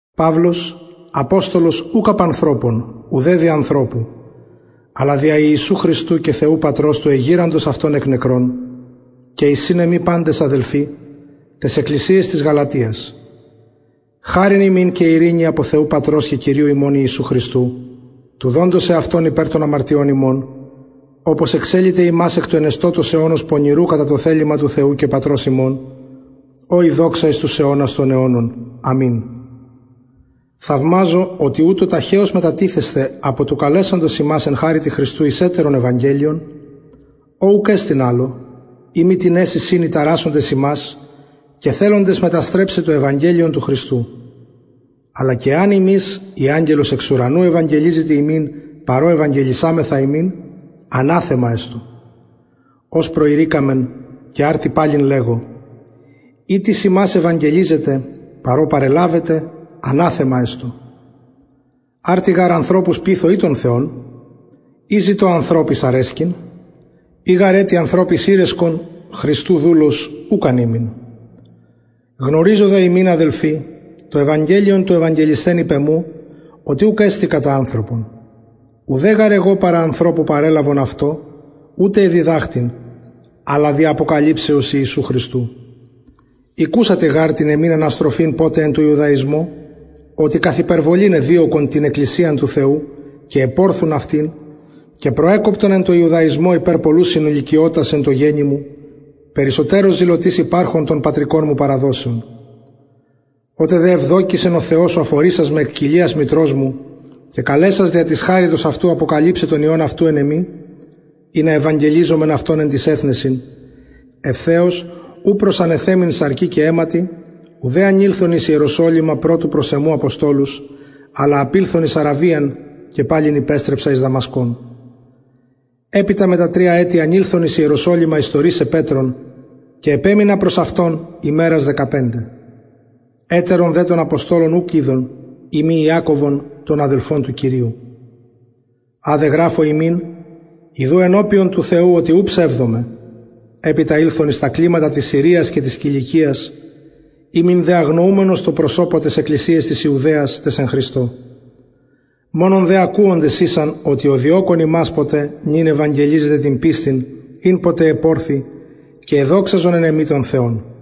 παυλος αποστολος ουκ απ ανθρωπων ουδε δι ανθρωπου αλλα δια ιησου χριστου και θεου πατρος του εγειραντος αυτον εκ νεκρων και οι συν εμοι παντες αδελφοι ταις εκκλησιαις της γαλατιας χαρις υμιν και ειρηνη απο θεου πατρος και κυριου ημων ιησου χριστου του δοντος εαυτον περι των αμαρτιων ημων οπως εξεληται ημας εκ του ενεστωτος αιωνος πονηρου κατα το θελημα του θεου και πατρος ημων ω η δοξα εις τους αιωνας των αιωνων αμην θαυμαζω οτι ουτως ταχεως μετατιθεσθε απο του καλεσαντος υμας εν χαριτι χριστου εις ετερον ευαγγελιον ο ουκ εστιν αλλο ει μη τινες εισιν οι ταρασσοντες υμας και θελοντες μεταστρεψαι το ευαγγελιον του χριστου αλλα και εαν ημεις η αγγελος εξ ουρανου ευαγγελιζηται υμιν παρ ο ευηγγελισαμεθα υμιν αναθεμα εστω ως προειρηκαμεν και αρτι παλιν λεγω ει τις υμας ευαγγελιζεται παρ ο παρελαβετε αναθεμα εστω αρτι γαρ ανθρωπους πειθω η τον θεον η ζητω ανθρωποις αρεσκειν ει γαρ ετι ανθρωποις ηρεσκον χριστου δουλος ουκ αν ημην γνωριζω δε υμιν αδελφοι το ευαγγελιον το ευαγγελισθεν υπ εμου οτι ουκ εστιν κατα ανθρωπον ουδε γαρ εγω παρα ανθρωπου παρελαβον αυτο ουτε εδιδαχθην αλλα δι αποκαλυψεως ιησου χριστου ηκουσατε γαρ την εμην αναστροφην ποτε εν τω ιουδαισμω οτι καθ υπερβολην εδιωκον την εκκλησιαν του θεου και επορθουν αυτην και προεκοπτον εν τω ιουδαισμω υπερ πολλους συνηλικιωτας εν τω γενει μου περισσοτερως ζηλωτης υπαρχων των πατρικων μου παραδοσεων οτε δε ευδοκησεν ο θεος ο αφορισας με εκ κοιλιας μητρος μου και καλεσας δια της χαριτος αυτου αποκαλυψαι τον υιον αυτου εν εμοι ινα ευαγγελιζωμαι αυτον εν τοις εθνεσιν ευθεως ου προσανεθεμην σαρκι και αιματι ουδε ανηλθον εις ιεροσολυμα προς τους προ εμου αποστολους αλλα απηλθον εις αραβιαν και παλιν υπεστρεψα εις δαμασκον επειτα μετα ετη τρια ανηλθον εις ιεροσολυμα ιστορησαι πετρον και επεμεινα προς αυτον ημερας δεκαπεντε ετερον δε των αποστολων ουκ ειδον ει μη ιακωβον τον αδελφον του κυριου α δε γραφω υμιν ιδου ενωπιον του θεου οτι ου ψευδομαι επειτα ηλθον εις τα κλιματα της συριας και της κιλικιας ημην δε αγνοουμενος τω προσωπω ταις εκκλησιαις της ιουδαιας ταις εν χριστω μονον δε ακουοντες ησαν οτι ο διωκων ημας ποτε νυν ευαγγελιζεται την πιστιν ην ποτε επορθει και εδοξαζον εν εμοι τον θεον